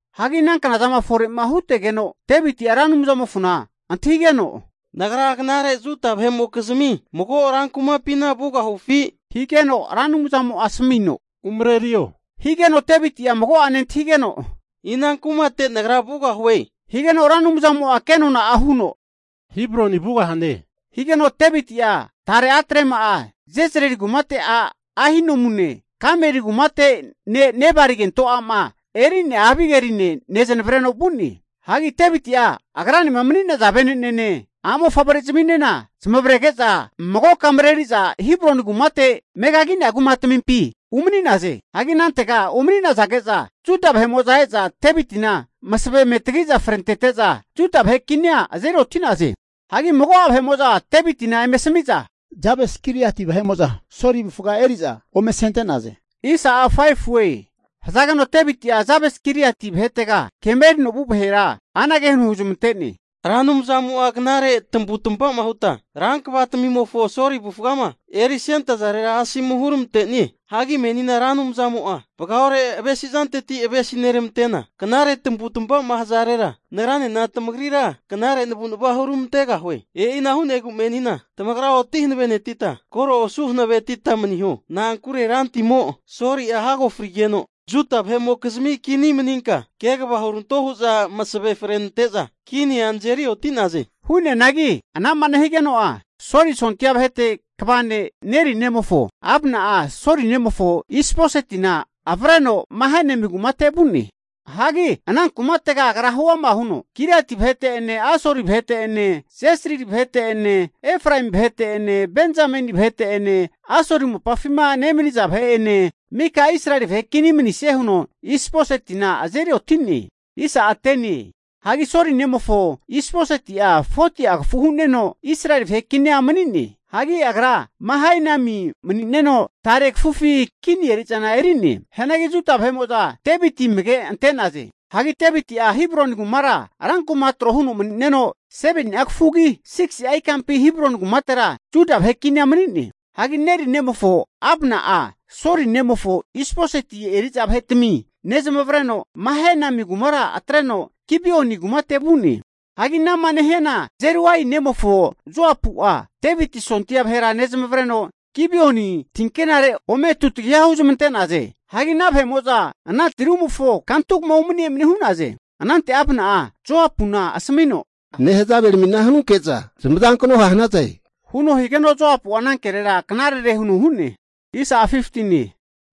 Hagi ana knazama fore'ma hutegeno, Deviti'a Ra Anumzamofona antahigeno, Nagra knare Juda vahe'mokizmi mago rankumapina vugahufi? Higeno Ra Anumzamo'a asamino, Umarerio higeno Deviti'a mago'ane antahigeno, Ina kumate nagra vugahue? Higeno Ra Anumzamo'a kenona'a huno, Hebroni vugahane. Higeno Deviti'a tare a'trema'a Jezrieli kumateti a' Ahinoamune, Karmeli kumate ne' Nebali kento a'ma eri'nea Abigeline nezanavreno vu'ne. Hagi Deviti'a agranema mani'naza vene'nene, a'mofavre'zaminena zamavarege'za magoka mareri'za Hebroni kumate megagi'nea kumatamimpi umani'naze. Hagi anantega umani'nazage'za, Juda vahe'mo'za e'za Devitina masavena eme tagi'za frenente'za Juda vahe kinia azeri oti'naze. Hagi mago'a vahe'mo'za Devitina eme asamiza, Jabesh-Giliat vahe'mo'za Soli avufga eri'za ome asente'naze. Hazageno Deviti'a Jabes-Giliati vahetega kema erino vu vahera anage huno huzmante'ne, Ra Anumzamo'a knare tamavutamava huta rankvatamimofo Soli avufgama erisentazarera, asomu huramante'nie. Hagi menina Ra Anumzamo'a vagaore avesizanteti avesineramantena, knare tamavu'tamava'ma hazarera nagranena tamagrira knare navu'nava huramantegahue. E'ina hu'negu menina tamagra oti hanavenetita, koro osu hanavetita maniho. Na'ankure rantimo Soli'a hago frigeno, Juda vahe'mo'za kini maninka kegava huranto hu'za masave frenante'za kinia nazeri oti'naze. Hu'neanagi ana'ma nehigeno'a, Soli sondia vahete kva ne' Neri nemofo Abna'a Soli nemofo Is-bosetina avreno Mahanaimi kumate vu'ne. Hagi ana kumatega agra huama huno, Giliati vahete'ene, Asuri vahete'ene, Jezrili vahete'ene, Efraemi vahete'ene, Benzameni vahete'ene Asuri mopafima nemaniza vahe'ene mika Israeli vahe kini manisie huno Is-bosetina azeri oti'ne. Hagi Soli nemofo Is-boseti'a 40'a kafu hu'neno, Israeli vahe kinia mani'ne. Hagi agra Mahanaimi mani'neno tare kafufi kini eri'zana eri'ne. Hianagi Juda vahe'mo'za Deviti amage ante'naze. Hagi Deviti'a Hebroni kumara rankuma'a tro huno mani'neno, 7ni'a kafugi 6'a ikampi Hebroni kumatera Juda vahe kinia mani'ne. Hagi Neri nemofo Abna'a Soli nemofo Is-boseti eri'za vahetami nezamavareno, Mahanaimi kumara atreno Gibeoni kumate vu'ne. Hagi anama nehiana Zeruia nemofo Joapu'a Deviti sondia vahera nezamavareno Gibeoni tinkerire ome tutagiha huzmante'naze. Hagi ana vahe'mo'za ana tirumofo kantugama umani emani hu'naze. Anante Abna'a Joapuna asamino, Nehazaveramina hanunke'za zamazankno ha' hanaze huno higeno Joapu'a ana kerera, knarere huno hu'ne.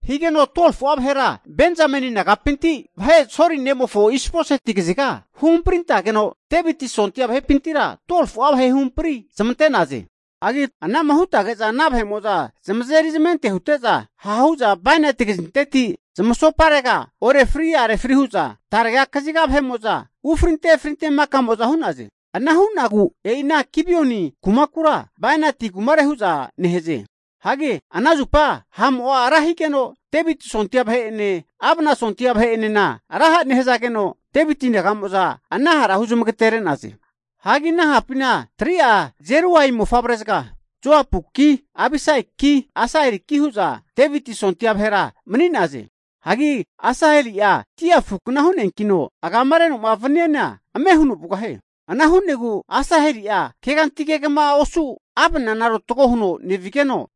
Higeno 12fu'a vahera Benzameni nagapinti vahe Soli nemofo Is-boseti kaziga huhamprintageno, Deviti sondia vahepintira 12fu'a vahe huhampri zamante'naze. Hagi ana'ma hutage'za ana vahe'mo'za zamazeri zamente hute'za, ha'hu'za bainati kazinteti zamasoparega orefri are fri hu'za tarega kaziga vahe'mo'za ufrinte efrinte maka'mo'za hu'naze. Ana hu'nagu e'i ana Gibioni kumakura, bainati kumare hu'za nehaze. Hagi ana zupa ha'mo'a ra higeno, Deviti sondia vahe'ene, Abna sondia vahe enena ra ha nehazageno, Deviti naga'mo'za ana hara huzamagatere'naze. Hagi ana hapina 3'a Jeruia mofavrezaga, Joapuki, Abisaiki, Asaheliki hu'za Deviti sondia vahera mani'naze. Hagi Asaheli'a dia afukna hu'neankino, agamareno vaniana ame huno vugahie. Ana hu'negu Asaheli'a keganti kegama osu Abnana rotago huno nevigeno,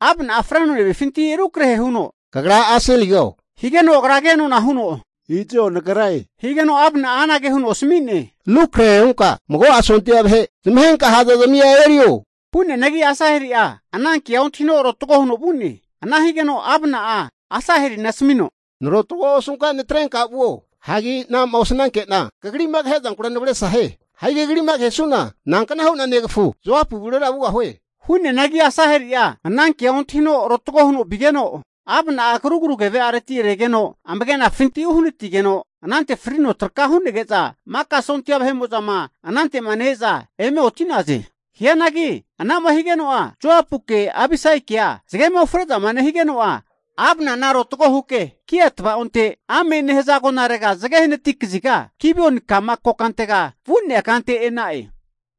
Abna'a freno nevifinti rukrehe huno, Kagra Asaheligo? Higeno agra kenona huno, Izo nagre. Higeno Abna'a anage huno asami'ne, Rukrahe hunka mago'a sondia vahe zamahenka ha'zazmia erio, hu'neanagi Asaheli'a ananke'a ontahi rotago huno vu'ne. Ana higeno Abna'a Asahelina asamino, Narotogoa osunka natrenka vuo. Hagi anama osanankena kagri'ma kahezankura navesra hie. Hagi kagri'ma kahesu'na nankna hu'na negafu Joapu avurera vugahue? Hu'neanagi Asaheli'a ana ke'a ontahino, rotago huno vigeno Abna'a krugru keve'areti regeno amagenafinti uhanatigeno, anante frino traka hu'nege'za maka sondia vahe'mo'zama anante'ma ne-eza eme oti'naze. Hianagi anama hige'nea Joapuke Abisaikea zagema ufre'zama nehigekea Abnana rotago huke, Gia tavaonte Amae nehaza agonare zage hanati kaziga Gibeoni ka'ma kokantega vu'nea kante e'na'e.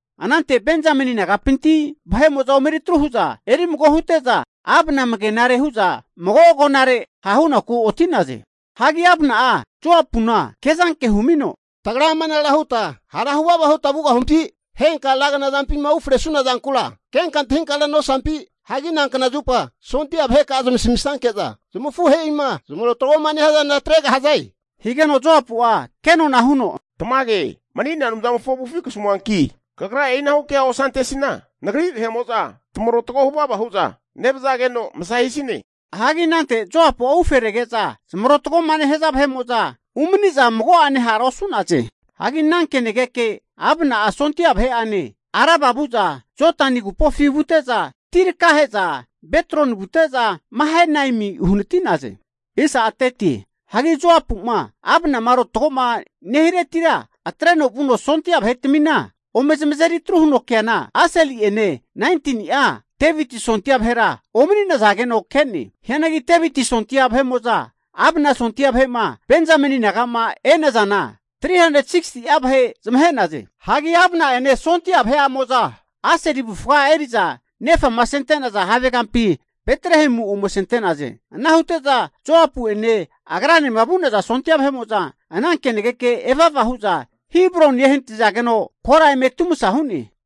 Anante Benzameni nagapinti vahe'mo'za omeri atru hu'za eri mago hute'za, Abna amagenare hu'za mago agonare ha' hunaku oti'naze. Hagi Abna'a Joapuna ke'zanke humino, tagra amanara huta hara huvava huta vugahupi? Henka ra knazampima ufresuna zankura kenka antahinkara nosampi? Hagi nankna zupa sondia vaheka'a zamasamisanke'za zamafuhe'ima zamarotagoma nehaza zana atregahaze? Higeno Joapu'a kenona huno, Tamage mani'nea Anumzamofo avufi kasamuanki, kagra e'inahu kea osantesina nagri vahe'mo'za tamarotago huvava hu'za nevazageno masa hisine. Hagi anante Joapu'a ufe rege'za zamarotagoma nehaza vahe'mo'za umani'za, mago'ane hara osu'naze. Hagi ana kenageke Abna'a sondia vahe'ane Araba vu'za Jodani agupofi vute'za, ti rakahe'za Bitroni vute'za, Mahanaim uhanati'naze. Hagi Joapu'ma Abnama rotagoma nehiretira atreno, vuno sondia vahetamina ome zamazeri atru huno keana, Asaheli'ene 19ni'a Deviti sondia vahera omani'nazageno ke'ne. Hianagi Deviti sondia vahe'mo'za, Abna sondia vahe'ma Benzameni naga'ma e'nazana 360'a vahe zamahe'naze. Hagi Abna'ene sondia vahe'amo'za Asaheli avufga eri'za nefama asente'naza havegampi Betlehemu ome asente'naze. Ana hute'za Joapu'ene agranema vu'naza sondia vahe'mo'za ana kenageke eva eva hu'za, Hebroni ehanatizageno kora eme atumasa hu'ne.